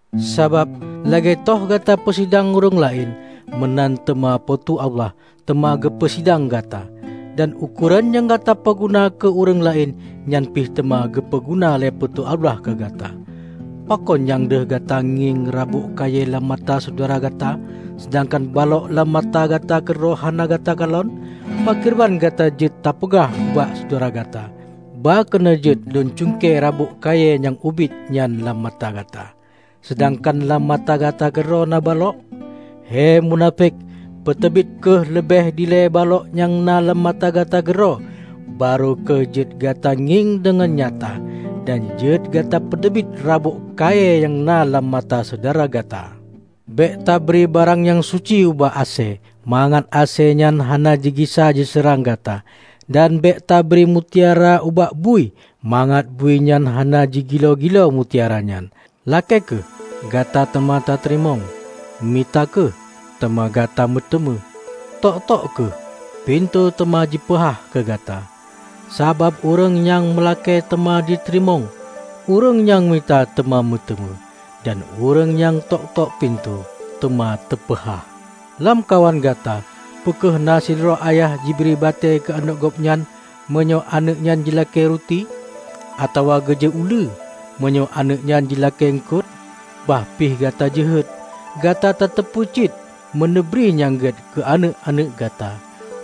Sabab lagée toh gata peusidang ureuëng laén, meunan teuma Po teu Allah teuma geupeu sidang gata. Dan ukoran nyang gata peuguna keu ureuëng laén, nyan pih teuma geupeu guna lé Po teu Allah keu gata. Pakon nyang deuh gata ngieng rabôk kayée lam mata syedara gata, seudangkan balok lam mata gata keudroe hana gata kalon? Pakriban gata jeuet tapeugah ubak syedara gata, 'Ba keunoe jeuet lôn cungke rabôk kayée nyang ubit nyan lam mata gata,' seudangkan lam mata gata keudroe na balok? He munafék! Peuteubiet kheueh leubeh dilée balok nyang na lam mata gata keudroe, barô kheueh jeuet gata ngieng deungon nyata, dan jeuet gata peuteubiet rabôk kayée nyang na lam mata syedara gata. Bék tabri barang nyang suci ubak asée, mangat asée nyan hana jigisa jiseurang gata. Dan bék tabri mutiara ubak bui, mangat bui nyan hana jigiloe-giloe mutiara nyan." "Lakée kheueh, gata teuma tateurimong. Mita kheueh, teuma gata meuteumé. Tok-tok kheueh, pintoe teuma jipeuhah keu gata. Sabab ureuëng nyang meulakée teuma jiteurimong; ureuëng nyang mita teuma meuteumé; dan ureuëng nyang tok-tok pintoe, teuma teupeuhah. Lamkawan gata peu kheueh na sidroe ayah jibri batée keu aneuëk gobnyan, meunyoe aneuëk nyan jilakée ruti? Atawa geujok uleue, meunyoe aneuëk nyan jilakée uengkot? Bah pih gata jeuhet, gata tateupeue cit meuneubri nyang gét keu aneuëk-aneuëk gata.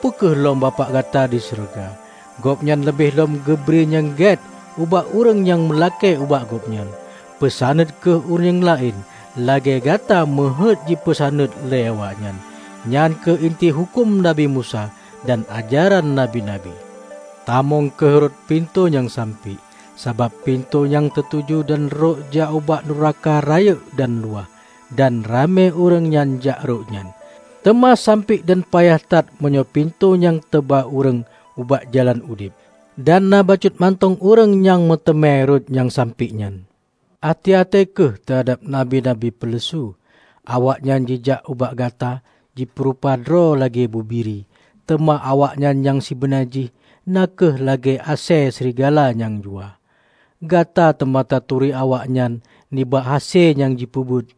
Peu kheueh lom Bapak gata di syeuruga! Gobnyan leubeh lom geubri nyang gét ubak ureuëng nyang meulakée ubak Gobnyan. Peusaneut kheueh ureuëng laén lagée gata meuheuét jipeusaneut lé awaknyan. Nyan kheueh inti huköm Nabi Musa dan ajaran nabi-nabi." "Tamong kheueh rot pintoe nyang sampiek, sabab pintoe nyang teutuju dan rot jak ubak nuraka rayeuk dan luwah, dan ramé ureuëng nyang jak rot nyan. Teuma sampiek dan payah that meunyoe pintoe nyang teuba ureuëng ubak jalan udeb. Dan na bacut mantong ureuëng nyang meuteumé rot nyang sampiek nyan." "Até-até kheueh teuhadab nabi-nabi peuleusu. Awaknyan jijak ubak gata jipeurupa droe lagée bubiri, teuma awaknyan nyang sibeuna jih na kheueh lagée asée srigala nyang juah. Gata teuma taturi awaknyan nibak hase nyang jipeubuet.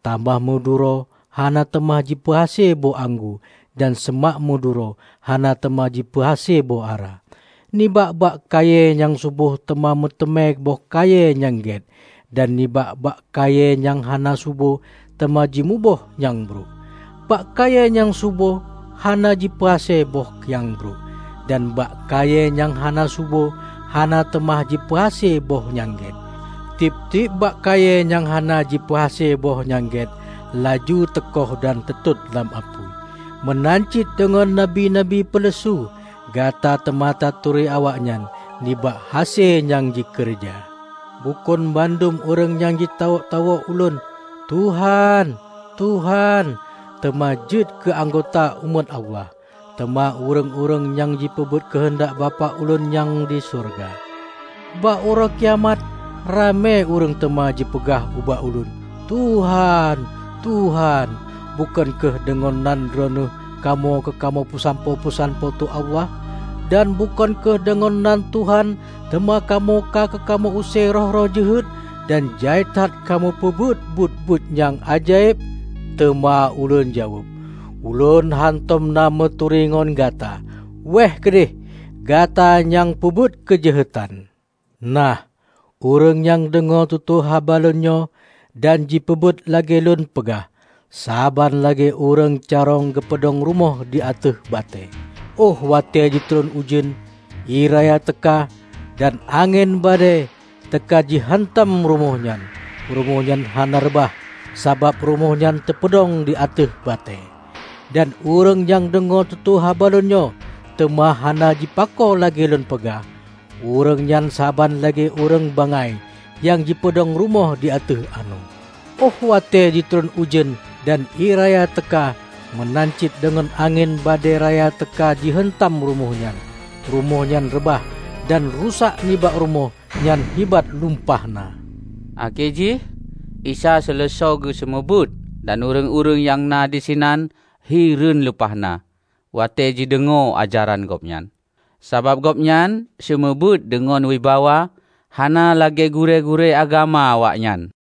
Tamah meuduro hana teuma jipeuhase boh anggô, dan seumak meuduro hana teuma jipeuhase boh ara. Nibak bak kayée nyang subo teuma meuteumé boh kayée nyang gét, dan nibak bak kayée nyang hana subo teuma jimuboh nyang brok. Bak kayée nyang subo hana jipeuhase boh nyang brok, dan bak kayée nyang hana subo hana teuma jipeuhase boh nyang gét. Tieb-tieb bak kayée nyang hana jipeuhase boh nyang gét, laju teuköh dan teutot lam apui. Meunan cit deungon nabi-nabi peuleusu. Gata teuma taturi awaknyan nibak hase nyang jikeureuja." "Bukon bandum ureuëng nyang jitawök-tawök Ulôn, 'Tuhan, Tuhan,' teuma jeuet keu anggota umat Allah, teuma ureuëng-ureuëng nyang jipeubuet keuheundak Bapak Ulôn nyang di syeuruga. Bak Uroe Kiamat ramé ureuëng teuma jipeugah ubak Ulôn, 'Tuhan, Tuhan, bukon kheueh deungon nan Droeneueh, kamoe ka kamoe peusampoe peusan Po teu Allah? Dan bukon kheueh deungon nan Tuhan teuma kamoe ka kamoe use roh-roh jeuhet dan jai that kamoe peubuet buet-buet nyang ajaéb?' Teuma Ulôn jaweueb, 'Ulôn hántom na meuturi ngon gata! Wéeh keudeh, gata nyang peubuet keujeuhetan!' " "Nah, ureuëng nyang deungoe tutoe haba Lôn nyoe, dan jipeubuet lagée Lôn peugah, saban lagée ureuëng carông geupeudong rumoh di ateueh batée. Óh watée jitron ujeuen, ié raya teuka, dan angén badée teuka jiheuntam rumoh nyan, rumoh nyan hana reubah sabab rumoh nyan teupeudong di ateueh batée. Dan ureuëng nyang deungoe tutoe haba Lôn nyoe, teuma hana jipako lagée Lôn peugah, ureuëng nyan saban lagée ureuëng bangai nyang jipeudong rumoh di ateueh anoe. Óh watée jitron ujeuen, dan ié raya teuka meunan cit deungon angén badée raya teuka jiheuntam rumoh nyan, rumoh nyan reubah. Dan rusak nibak rumoh nyan hibat lumpah na!" Akhé jih Isa seuleusoe geuseumeubeuet, dan ureuëng-ureuëng nyang na disinan hireuen lumpah na watée jideungoe ajaran Gobnyan. Sabab Gobnyan seumeubeuet deungon wibawa, hana lagée gurée-gurée agama awaknyan.